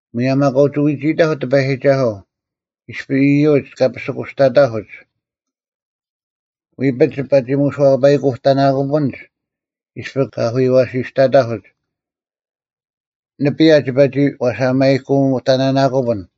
ᒧᔭᒻ ᐊᑲ ᐅᒋ ᐎᒋᐃᑕᐧᒄ ᑎᐸᔨᒋᒐᓱᐤ, ᐃᔅᐱ ᐃᔪᒡ ᑲ ᐱᓯᑯᔅᑕᑕᐧᑯᒡ: ᐎᐱᒡ ᒋᐸ ᒋ ᒥᓱᐛᐸᔨᐃᑯᑕᓇᑯᐱᓐᒡ, ᐃᔅᐱ ᑲ ᐊᐧᑯᔪᐛᓯᔅᑕᑕᐧᑯᒡ: ᓂᐱᔭ ᒋᐸ ᒋ ᐛᓴᒥᐃᑯᑕᓇᓇᑯᐱᓐ,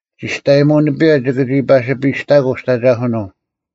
ᒋᔅᑕᔨᒧᐤ ᓂᐱᔭ ᒋᑭ ᒋ ᐸᓯᒋᐸᔨᔅᑕᑯᐤ ᒋᑦ ᐊᒐᐧᑯᓄᐤ᙮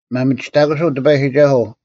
ᒪᒥᒋᑕᑯᓱᐤ ᑎᐸᔨᒋᒐᓱᐤ,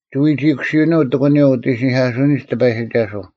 ᒋ ᐎᒋᐃᑯᓯᐅᓄᐤ ᑎᑯᓂᔪᐤ ᐅᑦ ᐃᓯᓂᐧᑲᓱᐅᓂᒡ ᑎᐸᔨᒋᒐᓱᐤ,